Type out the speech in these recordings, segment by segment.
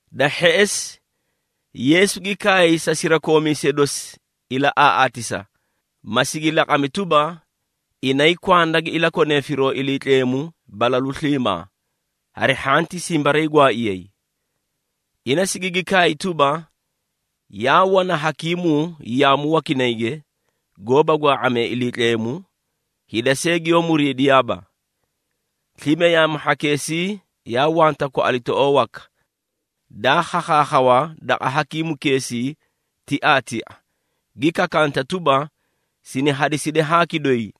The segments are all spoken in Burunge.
Da hheꞌesi, Yeesu gi kaay sa sirakoomiisee dosi ilaꞌaaꞌaatisa, ma sigi laqami tuba, inay kwanda gi ilakonee firoo Iliitleemu balalu sliimaa, hari hhanti simbariigwaaiyay. Ina sigigi kaay tuba, “Yaa wana hakiimuu yaamu wakinayge, goóba gwaa⁄amee Iliitleemu, hida see giyoó muriidiyaaba. Slime yaamu hhakeesii, yaa wanta kwaꞌalitoꞌoo waka, daa khakhaakhawa daqa hakiimukeesii tiaatia, gi kakanta tuba, ‘Sini hadiside haaki doyi,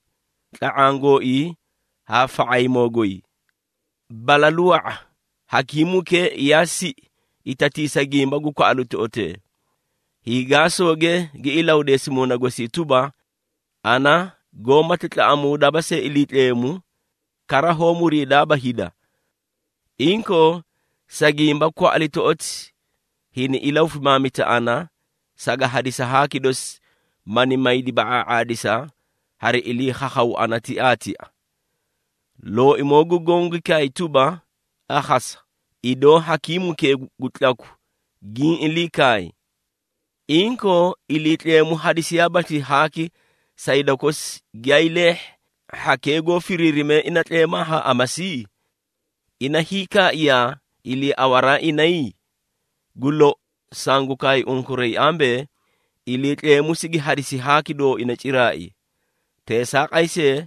tla⁄aã gooii haa fa⁄aymoo goy.’ Balalu wa⁄a, hakiimukee yaa siꞌi itatiisa gimba gu kwaꞌalitoꞌotee. Hiigaasooge gi ilahudeesi muuna gosii tuba, ‘Ana goómati tlaꞌamuudaaba see Iliitleemu, kara hoó muriidaaba hida. Inkoo, sa gimba kwaꞌalitoꞌoti hini ilahufimaamita ana, saga hadisi haaki dosi, mani maydi ba⁄aa⁄aadisa hari ilii khakhawuu ana tiaatia.’” Looimoo gu Goõ gi kaay tuba, “Akhasa, idoo hakiimukee gu tlaku giĩ ilii kaay. Inkoo, Iliitleemu hadisiyaabaaslii haaki sa hida kosi giyaay leehhi, hhakee goó firiirimee ina tleemaa haa amasi? Ina hiikaaiyaa iliiawaraa inay? Gu lou, sangu kaay unkuray ambee, Iliitleemu sigi hadisi haaki dooina ciraai. Teesaaqay see,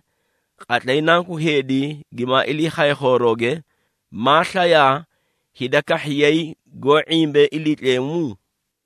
qatlay Nanku Heedi gimaa ilii khaye khoorooge, maaslayaa hida kahhiyay goó ⁄imbee Iliitleemu?”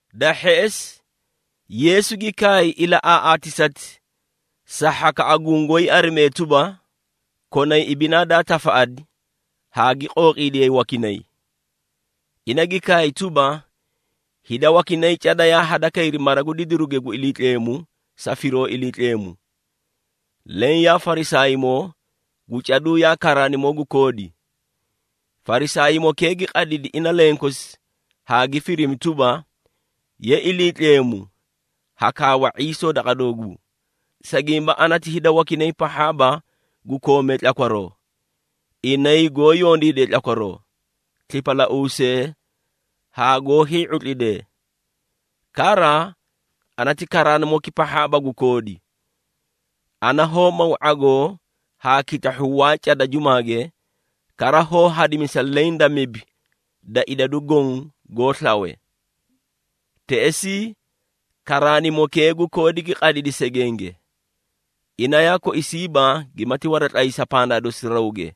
Da hheꞌesi, Yeesu gi kaay ilaꞌaaꞌaatisati sa hhakaꞌa gungoóyi arimee tuba, konay ibinaa daa tafaꞌadi haa gi qooqiidiyay wakinay. Ina gi kaay tuba, “Hida wakinay cada yaa hadakayri mara gu didiruge gu Iliitleemu sa firoo Iliitleemu. Leẽ yaa Farisaaymoo gu caduu yaa karaanimoo gu koodi. Farisaaymokee gi qadidi ina lenkosi haa gi firimi tuba, ‘Ye Iliitleemu, ha kaawa ⁄iisoo daqa dooguu, sa gimba ana ti hida wakinay pahhaaba gu koomee tlakwaroo, inay goó yondiidee tlakwaroo, slipalauusee haa goó hii⁄utlidee. Kara ana ti karaanimoki pahhaaba gu koodi. Ana hoó maw ⁄agoo haa kitahhu waa cada jumaage, kara hoó hadimisa leẽ da mibi da idadu goõ goó slawe.’ Teꞌesii, karaanimokee gu koodi gi qadidi segenge. Ina yaa koisiiba gimati waratlaysa pandaa dosi rawge.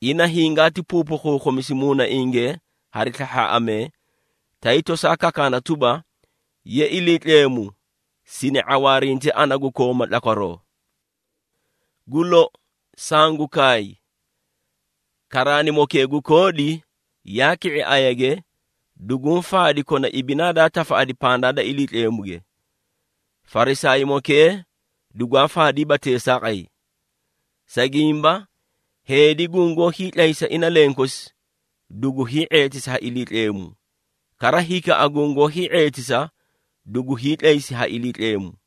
Ina hingaati puupukhuukhumisi muunainge hari slahhaaꞌamee, tay tosaa kakaana tuba, ‘Ye Iliitleemu, sini ⁄awaarinte ana gu kooma tlakwaroo.’ Gu lou, sangu kaay, karaanimokee gu koodi, yaa ki⁄i ayage, duguũ faadi kona ibinaa daa tafaꞌadi pandaa da Iliitleemuge. Farisaaymokee dugwaa faadiiba teesaaqay. Sa gimba heedi gungoó hiitlaysa ina lenkosi, dugu hii⁄eetisi ha Iliitleemu, kara hikaꞌa gungoó hii⁄eetisa, dugu hiitlaysi ha Iliitleemu.”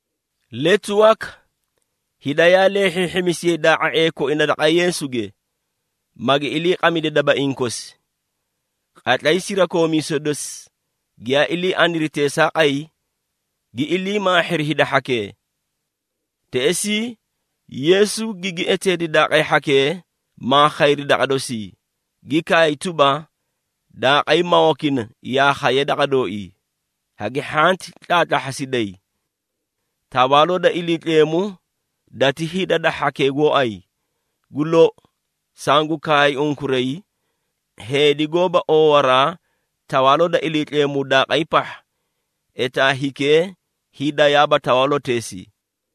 Letu waka, hida yaa leehhiihhimisiyay daa⁄a⁄ee koina daqa Yeesuge, magi iliiqamidi dabaiĩ kosi. Qatlay sirakoomiisee dosi giyaa ilii aniri teesaaqay, gi ilii maahhiri hida hhakee. Teꞌesii, Yeesu gigi eteedi daaqay hhakee maa khayri daqa dosii, gi kaay tuba, “Daaqay mawakina, yaa khayee daqa dooii, hagi hhanti tlaatlahhasiday. Tawaaloo da Iliitleemu dati hida da hhakee gooay. Gu lou, sangu kaay unkuray, heedi goóba oowaraa Tawaaloo da Iliitleemu daaqay pahha, etaa hikee hiidayaaba tawaaloteesii.”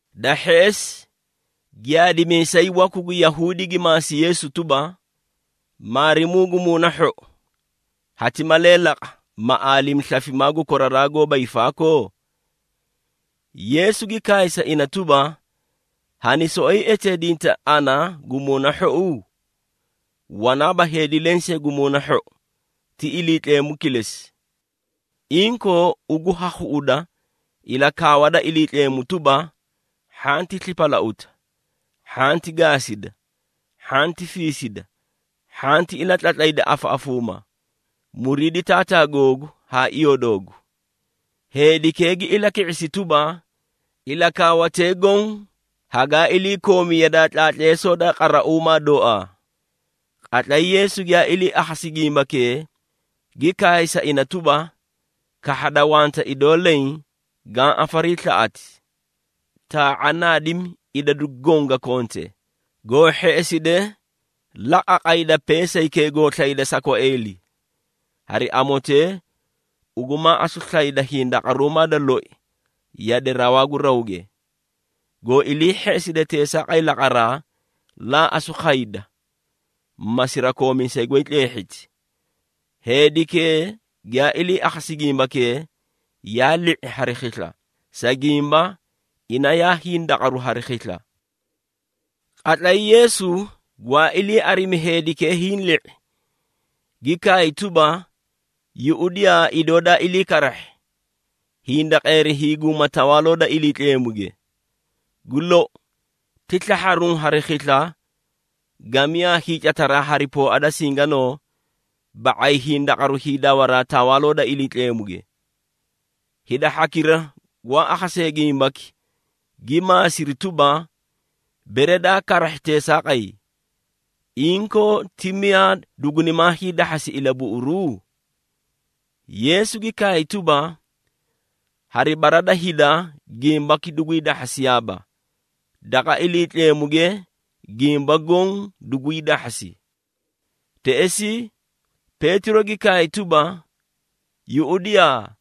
Da hheꞌesi, giyaadimiisay waku gu Yahuudi gi maasi Yeesu tuba, “Maarimuu gu muuna hhou, hati malee laqa, ma aalimi slafimaa gu koraraa goóba hiifaakoo?” Yeesu gi kaay sa ina tuba, “Hani soꞌoyi eteedinta ana gu muuna hhou? Wanaaba heedi lensee gu muuna hhou, ti Iliitleemu kilesi. Inkoo, ugu ha khuꞌuda ilakaawa da Iliitleemu tuba, ‘Hhanti slipalauta, hhanti gaasida, hhanti fiisida, hhanti ilatlatlayda afaꞌafuuma, muriidi taataa googu haa iyoo doogu.’” Heedikee gi ilaki⁄isi tuba, “Ilakaawatee goõ hagaa iliikoomi yadaa tlaatleesoo da qarauumaa dooaa.” Qatlay Yeesu giyaa ilii akhasi gimbakee, gi kaay sa ina tuba, “Kahhada wanta idoo leẽ gaã afariislaꞌati. Taa⁄a naadimi idadu goõ ga konte, goo hheꞌeside la qaqayda peesaykee goo slayde sa kwaeeli, hari amotee ugu maa asu slayda hindaqaruumaa da loi yade rawaa gu rawge. Goo ilii hheꞌeside teesaaqay laqaraa, laa asu khayda, ma sirakoomiisay goy tleehhiti.” Heedikee giyaa ilii akhasi gimbakee, yaa li⁄i hari khisla, sa gimba ina yaa hindaqaru hari khisla. Qatlay Yeesu gwaa ilii arimi heedikee hiĩ li⁄i, gi kaay tuba, “Yuꞌudiyaa idoo daa ilii karahhi, hindaqeeri hiiguuma Tawaaloo da Iliitleemuge! Gu lou, ti slahharuũ hari khisla, gamiyaa hiicataraa hari pooa da singanoo, ba⁄ay hindaqaru hiidawaraa Tawaaloo da Iliitleemuge.” Hida hhakira gwaa akhasee gimbaki, gi maasiri tuba, “Bere daa karahhi teesaaqay, inkoo ti miyaa dugunimaa hiidahhasi ilabuꞌuru?” Yeesu gi kaay tuba, “Hari bara da hida gimbaki dugwii dahhasiyaaba, daqa Iliitleemuge gimba goõ dugwii dahhasi.” Teꞌesii, Peetiro gi kaay tuba, “Yuꞌudiyaa,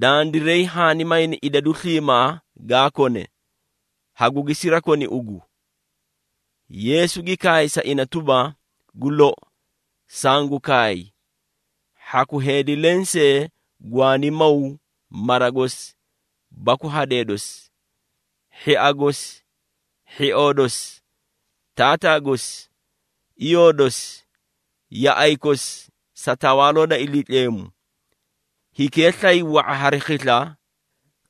dandiray haani mayni idadu sliimaa gaa kone, hagugi sirakoni ugu!” Yeesu gi kaay sa ina tuba, “Gu lou, sangu kaay, hhaku heedi lensee gwaani maw mara gosi baku hadee dosi, hhia gosi, hhioo dosi, taataa gosi, iyoo dosi, yaꞌay kosi sa Tawaaloo da Iliitleemu, hikee slay wa⁄a hari khisla,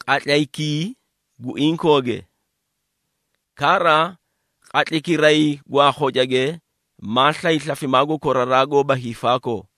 qatlaykii gu inkooge. Kara, qatlaykiray gwaa khocage maa slay slafimaa gu koraraa goóba hiifaakoo.”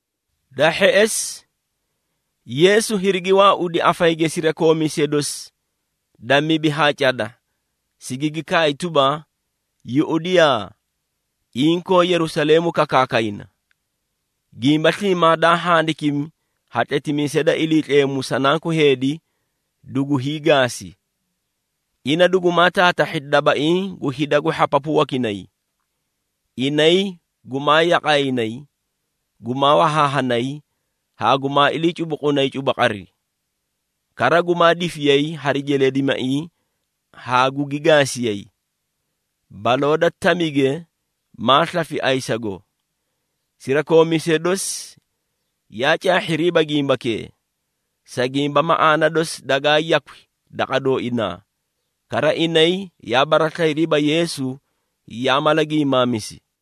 Da hheꞌesi, Yeesu hirigi waaudi afayige sirakoomiisee dosi da mibi haa cada, sigigi kaay tuba, “Yuꞌudiyaa, inkoo Yerusaleemu kakaakayna. Gimba sliimaa daa handikimi ha tletimiisee da Iliitleemu sa Nanku Heedi, dugu hiigaasi. Ina dugumaa taatahhi dabaiĩ gu hida gu hhapapu wakinay. Inay gumaa yaqaayinay, gumaa wahaahanay haa gumaa ilii cubuqunay cubuqari. Kara gumaa difiyay hari jeleedimaiĩ haa gugi gaasiyay. Baloo da tamige maa slafi ayisago.” Sirakoomiisee dosi yaa caahhiriiba gimbakee, sa gimba maꞌaana dosi dagaa yakwi daqa dooinaa, kara inay yaa baraslayiriiba Yeesu yaa mala giimaamisi.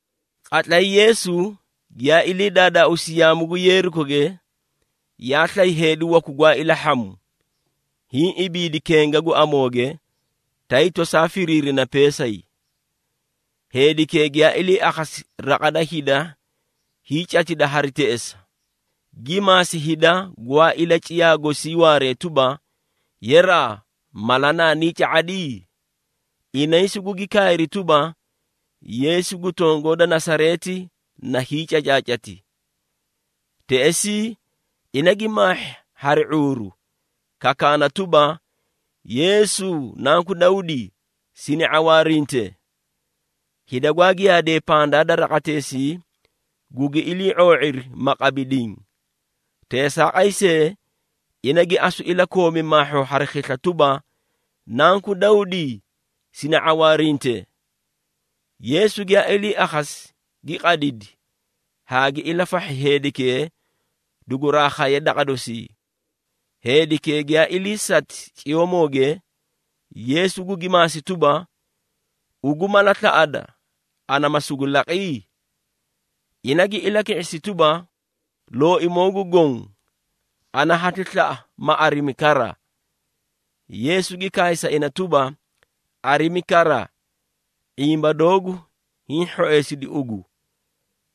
Qatlay Yeesu giyaa ilii daadaauusi yaamu gu Yeerikoge, yaa slay heedi waku gwaa ilahhamu, hiĩ ibiidi kenga gu amooge, tay tosaa firiirina peesay. Heedikee giyaa ilii akhasi raqa da hida hiicatida hari teꞌesa, gi maasi hida gwaa ilaciyaa gosii waaree tuba, “Yeraa! Mala naanii ca⁄adi?” Inay sugugi kaay tuba, “Yeesu gu tongoo da Nasareeti na hiicacaacati.” Teꞌesii, ina gi maahhi hari ⁄uuru, kakaana tuba, “Yeesu, Nanku Dawdi, sini ⁄awaarinte!” Hida gwaa giyaadee pandaa da raqateesii, gugi ilii ⁄oo⁄iri, ma qabi diĩ. Teesaaqay see, ina gi asu ilakoomi maahhoo hari khisla tuba, “Nanku Dawdi, sini ⁄awaarinte!” Yeesu giyaa ili akhasi, gi qadidi haa gi ilafahhi heedikee duguraa khaye daqa dosii. Heedikee giyaa iliisati ciyoomooge, Yeesu gugi maasi tuba, “Ugu mala slaꞌada, ana ma sugu laqi?” Ina gi ilaki⁄isi tuba, “Looimoo gu Goõ, ana hati slaꞌa ma arimi kara.” Yeesu gi kaay sa ina tuba, “Arimi kara! ⁄imba doogu hiĩ hhoeesidi ugu.”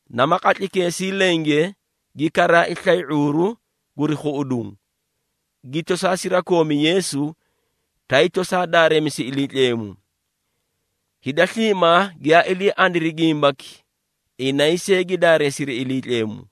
Nama qatlaykeesii lenge gi karaai slay ⁄uuru guri khuꞌuduũ, gi tosaa sirakoomi Yeesu, tay tosaa daareemisi Iliitleemu. Hida sliimaa giyaa ilii aniri gimbaki, inay see gi daareesiri Iliitleemu.